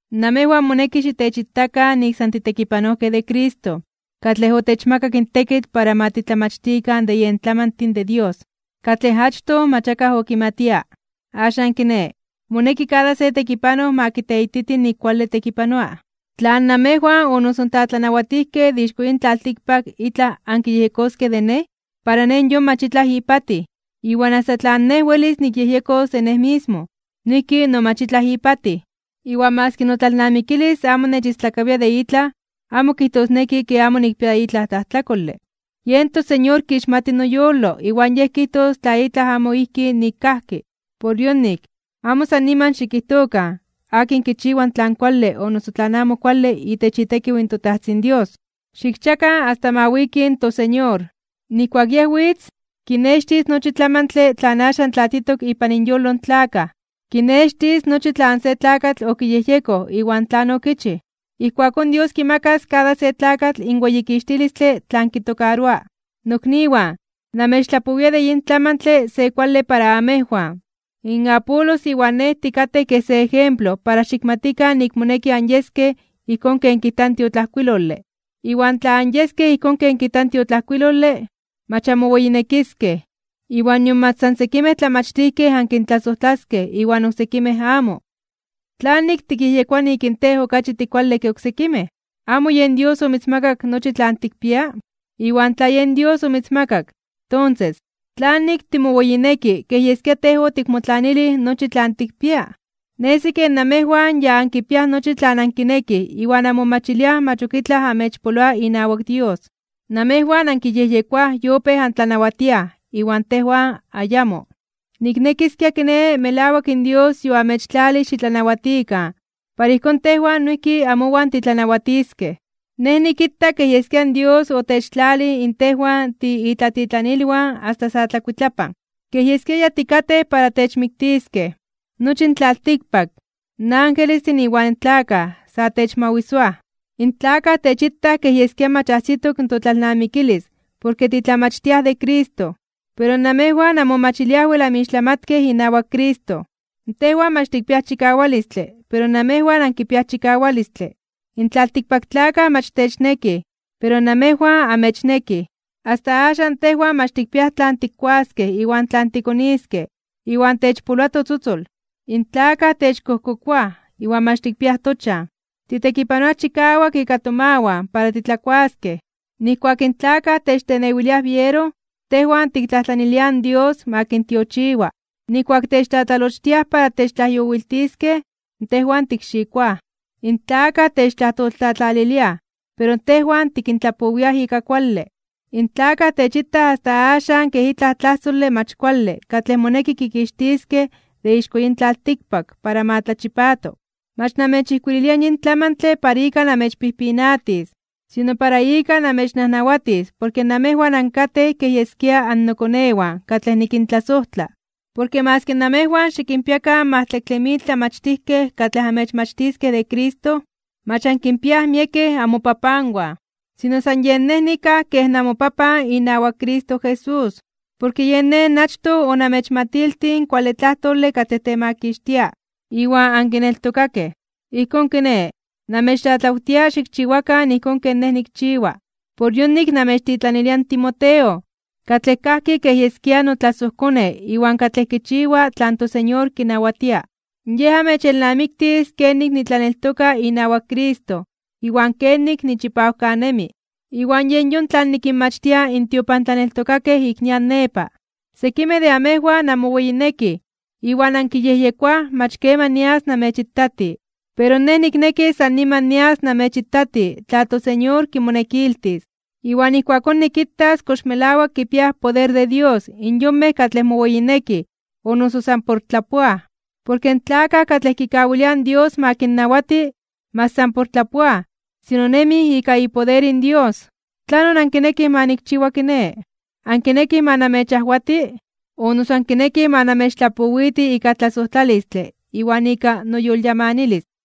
Namejwan moneki xitechitakan nik san titekipanojkej de Cristo, katlej otechmakak in tekitl para ma titlamachtikan de yen tlamantin de Dios, katlej achtoj mach akaj okimatia. Axan kiné, moneki kada se tekipanoj ma kiteititi nik kuale tekipanoa. Tlan namejwan o noso in tlatlanawatijkej de ixko yin tlaltikpak itlaj ankiyejyekoskej de nej, para nej yon mach itlaj ipatij. Iwan asta tlan nej welis nikyejyekos de nej mismo, noijki no mach itlaj ipatij. Iwan maski notlalnamikilis amo nechistlakawia de itlaj, amo kijtosneki ke amo nikpia itlaj tlajtlakole. Yen toSeñor kixmati noyolo iwan Yej kijtos tla itlaj amo ijki nik kajki. Por yonik, amo san niman xikijtokan akin kichiwa tlan kuale o noso tlan amo kuale itech itekiw in toTajtzin Dios. Xikchiakan asta ma wiki in toSeñor. Nijkuak Yej witz, kinextis nochi tlamantle tlan axan tlatitok ipan inyolo in tlakaj. Kinextis nochi tlan se tlakatl okiyejyekoj iwan tlan okichij. Ijkuakón Dios kimakas kada se tlakatl in weyikixtilistle tlan kitokaroa. Nokniwan, namechtlapowia de yin tlamantle se kuale para amejwan, in Apolos iwan nej tikatej kej se ejemplo para xikmatikan nik moneki anyeskej ijkón ken kijta in tiotlajkuilole. Iwan tla anyeskej ijkón ken kijta in tiotlajkuilole, mach anmoweyinekiskej, iwan nion mach san sekimej tlamachtijkej ankintlasojtlaskej iwan oksekimej amo. ¿Tlanik tikyejyekoa nik in tej okachi tikuale ke oksekimej? ¿Amo yen Dios omitzmakak nochi tlan tikpia? Iwan tla yen Dios omitzmakak, tonses, ¿tlanik timoweyineki kej yeskia tej otikmotlanilij nochi tlan tikpia? Nesi kej namejwan ya ankipiaj nochi tlan ankinekij iwan anmomachiliaj mach ok itlaj amechpoloa inawak Dios. Namejwan ankiyejyekoaj yopéj antlanawatiaj, iwan tejwan ayamo. Niknekiskia kiné melawak in Dios yoamechtlalij xitlanawatikan para ijkón tejwan noijki amowan titlanawatiskej. Nej nikita kej yeskia in Dios otechtlalij in tejwan tiitlatitlanilwan asta sa tlakuitlapan. Kej yeskia ya tikatej para techmiktiskej. Nochi in tlaltikpak, in angelestin iwan tlakaj, sa techmawisoaj. In tlakaj techitaj kej yeskia mach ajsitok totlalnamikilis porke titlamachtiaj de Cristo, pero namejwan anmomachiliaj wel anmixtlamatkej inawak Cristo. Tejwan mach tikpiaj chikawalistle, pero namejwan ankipiaj chikawalistle. In tlaltikpaktlakaj mach technekij, pero namejwan amechnekij. Asta axan tejwan mach tikpiaj tlan tikkuaskej iwan tlan tikoniskej, iwan techpoloa totzotzol. In tlakaj techkojkokoaj iwan mach tikpiaj tochan. Titekipanoaj chikawak ika tomawan para titlakuaskej. Nijkuak in tlakaj techtenewiliaj biero, tejwan tiktlajtlaniliaj in Dios ma kintiochiwa. Nijkuak techtlatlalochtiaj para techtlajyowiltiskej, tejwan tikxikoaj. In tlakaj techtlajtoltlatlaliliaj, pero tejwan tikintlapowiaj ika kuale. In tlakaj techitaj asta axan kej itlaj tlajsole mach kuale katlej moneki kikixtiskej de ixko yin tlaltikpak para ma tlachipato. Mach namechijkuililia yin tlamantle para ika namechpijpinatis, sino para ika namechnajnawatis porke namejwan ankatej kej yeskia annokonewan katlej nikintlasojtla. Porke maski namejwan xikinpiakan majtlaktle mil tlamachtijkej katlej amechmachtiskej de Cristo, mach ankinpiaj miekej amopapanwan. Sino san yen nej nikaj kej namopapan inawak Cristo Jesús, porke yen nej achtoj onamechmatiltij in kuale tlajtole katlej temakixtia, iwan ankineltokakej. Ijkón kiné, namechtlatlawtia xikchiwakan ijkón ken nej nikchiwa. Por yonik namechtitlanilia in Timoteo, katlej kajki kej yeskia notlasojkone iwan katlej kichiwa tlan toSeñor kinawatia. Yej amechelnamiktis kenik nitlaneltoka inawak Cristo iwan kenik nichipawkanemi, iwan yen yon tlan nikinmachtia in tiopantlaneltokakej ik nian nepa. Sekimej de amejwan anmoweyinekij iwan ankiyejyekoaj mach keman nias namechitati. Pero nej nikneki san niman nias namechitati tla in toSeñor kimonekiltis. Iwan ijkuakón nikitas kox melawak kipiaj poder de Dios in yonmej katlej moweyinekij o noso san por tlapoaj. Porke in tlakaj katlej kikawiliaj in Dios ma kinnawati, mach san por tlapoaj, sino nemij ika ipoder in Dios. ¿Tlanon ankinekij ma nikchiwa kiné? ¿Ankinekij ma namechajwati, o noso ankinekij ma namechtlapowiti ika tlasojtlalistle iwan ika noyolyamanilis?